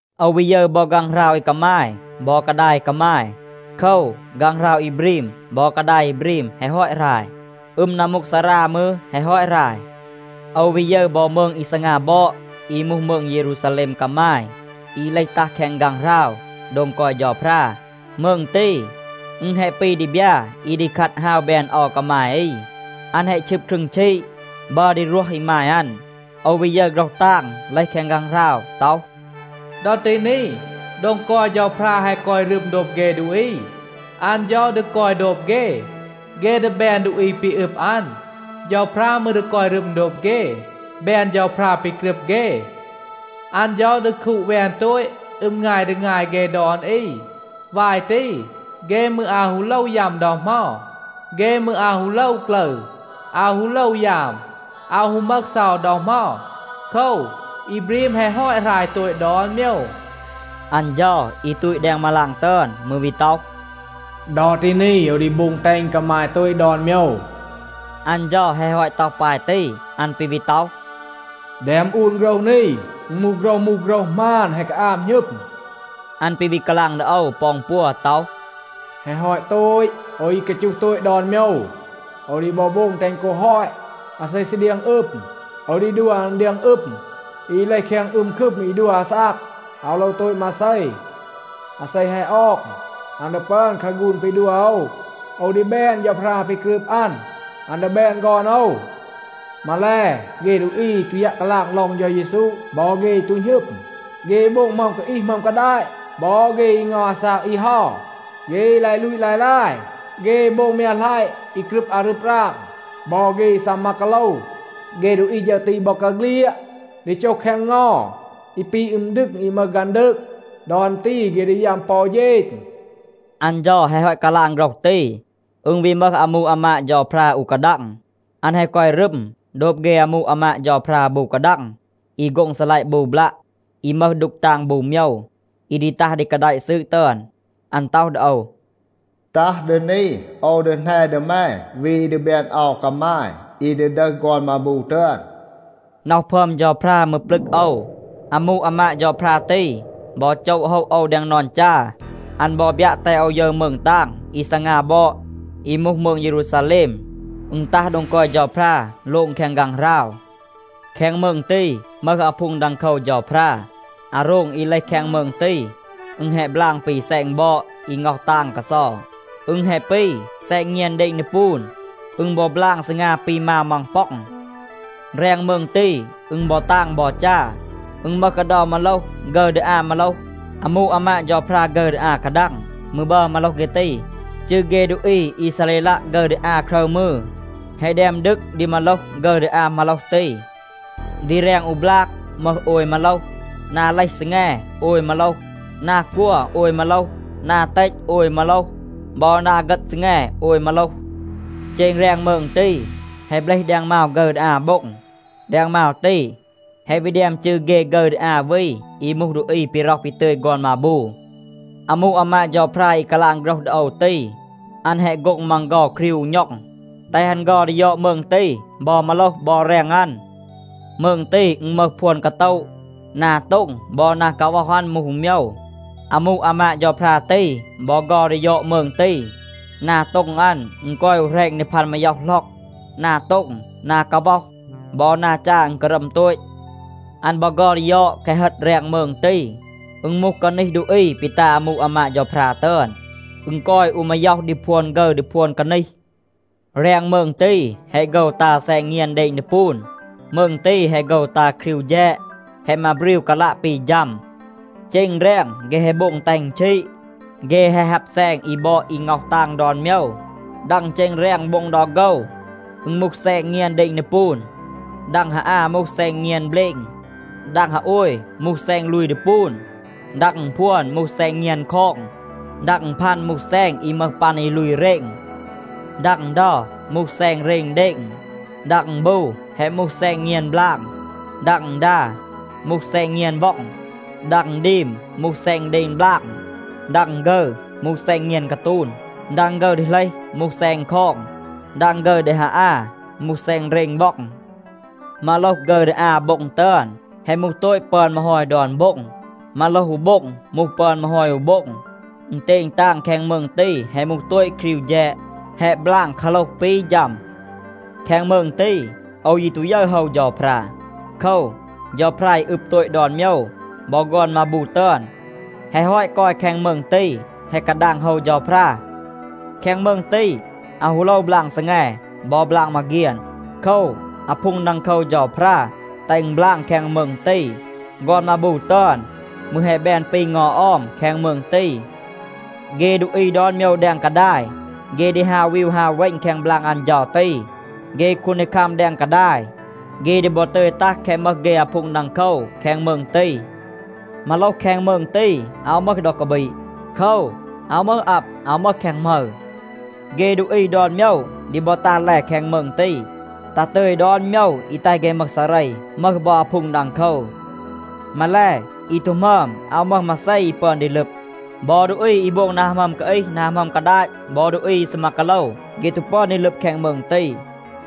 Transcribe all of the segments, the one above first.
โอว วี ยึร บอ ฆางหราว อี กามาย บอ กาดาย อี กามาย. โคว, ฆางหราว อี บรีม บอ กาดาย อี บรีม แฮะ ฮอต หราย. อึม นัมมูกซารา มืร แฮะ ฮอต หราย. โอว วี ยึร บอ มืง อี ซีงา บอด อี มูห มืง เยรูซาแลม กามาย อี เลห ตัห แคง ฆางหราว โดง กอย เฌาพรา. มืง ตี, อึณ แฮะ ปี ดีบยา อี ดี คัด ฮาว แบน เอา กามาย อี. อัน แฮะ ชึบ ครึง ชีด. บัร ดี รวห อีมาย อัน. โอว วี ยึร โฆรห ตาง เลห แคง ฆางหราว ต็อห, “ดอ ตี นี, โดง กอย เฌาพรา แฮะ กอย รึม โดบ เฆ ดูอี. อัน เฌา ดี กอย โดบ เฆ. เฆ ดี แบน ดูอี ปี อึบ อัน. เฌาพรา มืร ดี กอย รึม โดบ เฆ, แบน เฌาพรา ปี กรึบ เฆ. อัน เฌา ดี คูด แวน โตต อึม งาย ดี งาย เฆ ดอน อี. วาย ตี, เฆ มืร อาว ฮู โลว ยัม ดอ เหมา. เฆ มืร อาว ฮู โลว กลึร, อาว ฮู โลว ยาม, อาว ฮู มึห เซา ดอ เหมา. โคว, อี บรีม แฮะ ฮอต หราย โตต ดอน โมยว.” อัน เฌา อี ตูต แดง มาลาง ตึอน มืร วี ต็อห, “ดอ ตี นี โอว ดี โบง แตห อึณ กามาย โตต ดอน โมยว.” อัน เฌา แฮะ ฮอต ต็อห ปาย ตี, อัน ปี วี ต็อห, “แดม อูน โฆรห นี. อึณ มูห โฆรห มูห, โฆรห หมาน, แฮะ กาอาบ หณึม.” อัน ปี วี กาลาง ดี โอว ปอ อึณปัว ต็อห, “แฮะ ฮอต โตต. โอว อี กาจูห โตต ดอน โมยว, โอว ดี บอ โบง แตห อึณ กอ ฮอต.a อาเซ ซี เดียง อึม, โอว ดี ดัว อัน เดียง อึม อี เลห แคง อึม คึม อี ดัว อาซาก, อาว โลว โตต มาเซ. อาเซ แฮะ ออง, อัน ดี ปึอน คาฆูน ปี ดัว โอว. โอว ดี แบน เฌาพรา ปี กรึบ อัน. อัน ดี แบน ฆอน โอว. มาแล, เฆ ดูอี อี ตู ยัะ กาลาง ลอง เฌา เยซู บอ เฆ อี ตู หณึม, เฆ อี โบง หมึอม กาอีห, หมึอม กาดาต, บอ เฆ อี ง็อห อาซาก อี เฮา, เฆ อี ลาย ลูต ลาย ลาย, เฆ อี โบง มยัะหลัยะ, อี กรึบ อารึบ ราง บอ เฆ อี ซีมา กาโลว, เฆ ดูอี ฌึร ตี บอกาเฆลียด ดี โจห แคง เงา อี ปี อึม ดึง อี มึห ฆันดืก. ดอ อัน ตี เฆ ดี ยัม ปอ อู เฌณ.” อัน เฌา แฮะ ฮอต กาลาง โฆรห ตี, อึณ วี มึห อามู อามาด เฌาพรา อู กาดัง. อัน แฮะ กอย รึม โดบ เฆ อามู อามาด เฌาพรา บู กาดัง อี โฆ็ง ซีลัยะ บู บลัะ อี มึห ดูก ตาง บู โมยว อี ดี ตัห ดี กาแดะ ซืด ตึอน. อัน ต็อห ดี โอว, “ตัห ดี นี, โอว ดี แหน ดี แม วี อี ดี แบน เอา กามาย, อี ดี ดึห ฆอน มาบู ตึอน.” น็อห พึอม เฌาพรา มืร ปลึก โอว. อามู อามาด เฌาพรา ตี บอ โจะ โฮะ โอว แดง นอน จา. อัน บอ บยัะ แตห โอว ยึร มืง ตาง อี ซีงา บอด, อี มูห มืง เยรูซาแลม. อึณ ตัห โดง กอย เฌาพรา โลง แคง ฆางหราว. แคง มืง ตี มึห อาพูง ดังโคว เฌาพรา. อาโรง อี เลห แคง มืง ตี, อึณ แฮะ บลาง ปี แซณ บอด อี ง็อห ตาง กาเซา. อึณ แฮะ ปี แซณ เงียน เดณ ดีปูน. อึณ บอ บลาง ซีงา ปี มาว มังป็อง. แรง มืง ตี, อึณ บอ ตาง บอ จา. อึณ มึห กาเดา มาโลห ฆึร ดี อา มาโลห. อามู อามาด เฌาพรา ฆึร ดี อา กาดัง มืร บัร มาโลห เฆ ตี. จืร เฆ ดูอี อีซาเรลัะ ฆึร ดี อา ครึร มืร, แฮะ แดม ดึก ดี มาโลห ฆึร ดี อา มาโลห ตี. ดี แรง อู บลาก มึห โอย มาโลห. นา เลห ซีแง โอย มาโลห, นา กัว โอย มาโลห, นา เตต โอย มาโลห, บอ นา เฆต ซีแง โอย มาโลห. เจณ แรง มืง ตี, แฮะ เบลห แดง มาว ฆึร ดี อา โบ็ง. แดง มาว ตี, แฮะ วี แดม จืร เฆ ฆึร ดี อา วี อี มูห ดูอี ปี ร็อห ปี ตึย ฆอน มาบู. อามู อามาด เฌาพรา อี กาลาง โฆรห ดี โอว ตี, อัน แฮะ โฆ็ง มัง เฆา ครีว อู ณ็อง, แตห อัน เฆา ดี ยอด มืง ตี, บอ มาโลห บอ แรง อัน. มืง ตี, อึณ มึห พวน กาโตะ. นา โต็ง บอ นา กาว็อห อัน มูห อู โมยว. อามู อามาด เฌาพรา ตี บอ เฆา ดี ยอด มืง ตี. นา โต็ง อัน อึณ กอย อู แหรณ ดี พัน มาย็อห หล็อก. นา โต็ง, นา กาว็อห บอ นา จา อึณ การัม โตต. อัน บอ เฆา ดี ยอด แคะ เฮต แรง มืง ตี. อึณ มูห กานีห ดูอี ปี ตา อามู อามาด เฌาพรา ตึอน. อึณ กอย อู มาย็อห ดี พวน ฆึร ดี พวน กานีห. แรง มืง ตี, แฮะ โฆว ตา แซณ เงียน เดณ ดีปูน. มืง ตี แฮะ โฆว ตา ครีว แฌด, แฮะ มาบรีว กาลัะ ปี ฌัม. เจณ แรง เฆ แฮะ โบง แตห อึณ ชีด. เฆ แฮะ ฮับ แซณ อี บอด อี ง็อห ตาง ดอน โมยว. ดัง เจณ แรง โบ็ง ดอ โฆว, อึณ มูห แซณ เงียน เดณ ดีปูน. ดัง ฮา อา มูห แซณ เงียน เบลณ. ดัง ฮาโอย มูห แซณ ลูย ดีปูน. ดัง อึณพวน มูห แซณ เงียน คอง. ดัง อึณพัน มูห แซณ อี มึห ปัน อี ลูย เรณ. ดัง อึณเดา มูห แซณ เรณ เดณ. ดัง อึณบู แฮะ มูห แซณ เงียน บลาง. ดัง อึณดา มูห แซณ เงียน ว็อง. ดัง อึณดีม มูห แซณ เดณ บลาง. ดัง ฆึร มูห แซณ เงียน กาตูน. ดัง ฆึร ดี เหลห มูห แซณ คอง. ดัง ฆึร ดี ฮาอา มูห แซณ เรณ ว็อง. มาโลห ฆึร ดี อา โบ็ง ตึอน, แฮะ มูห โตต ปึอน มาฮอย ดอน โบ็ง. มาโลห อู โบ็ง มูห ปึอน มาฮอย อู โบ็ง. อึณเตณ ตาง แคง มืง ตี แฮะ มูห โตต ครีว แฌด. แฮะ บลาง กาโหลห ปี ฌัม. แคง มืง ตี, โอว ยี ตู ยึร โฮว เฌาพรา. โคว, เฌาพรา อี อึบ โตต ดอน โมยว บอ ฆอน มาบู ตึอน แฮะ ฮอต กอย แคง มืง ตี, แฮะ กาดาง โฮว เฌาพรา. แคง มืง ตี, อาว ฮู โลว บลาง ซีแง บอ บลาง มาเฆียน. โคว, อาพูง ดังโคว เฌาพรา แตห อึณ บลาง แคง มืง ตี. ฆอน มาบู ตึอน มืร แฮะ แบน ปี เงา ออม แคง มืง ตี. เฆ ดูอี ดอน โมยว แดง กาดาย, เฆ ดี ฮาว วีว ฮาว เวณ แคง บลาง อัน เฌา ตี. เฆ คูนดีคัม แดง กาดาย, เฆ ดี บอ ตึย ตัห แคะ มึห เฆ อาพูง ดังโคว แคง มืง ตี. มาโลห แคง มืง ตี, อาว มึห ดอ กาบีด. โคว, อาว มึห อับ, อาว มึห แคง หมึร. เฆ ดูอี ดอน โมยว ดี บอ ตัห แล แคง มืง ตี, ตัห ตึย ดอน โมยว อี แตห เฆ มึห ซาเร, มึห บอ อาพูง ดังโคว. มาแล, อี ตู หมึอม อาว มึห มาเซ อี ปึอน ดี ลึบ. บอ ดูอี อี โบง นา หมึอม กาอีห, นา หมึอม กาดาต บอ ดูอี อี ซีมา กาโลว, เฆ ตู ปึอน ดี ลึบ แคง มืง ตี.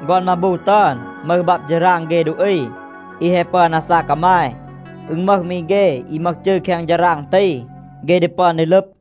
ฆอน มาบู ตึอน มึห บับ ฌาราง เฆ ดูอี อี แฮะ ปึอน อาซาก กามาย. อึณ มึห มี เฆ อี มึห จืร แคง ฌาราง ตี, เฆ ดี ปึอน ดี ลึบ.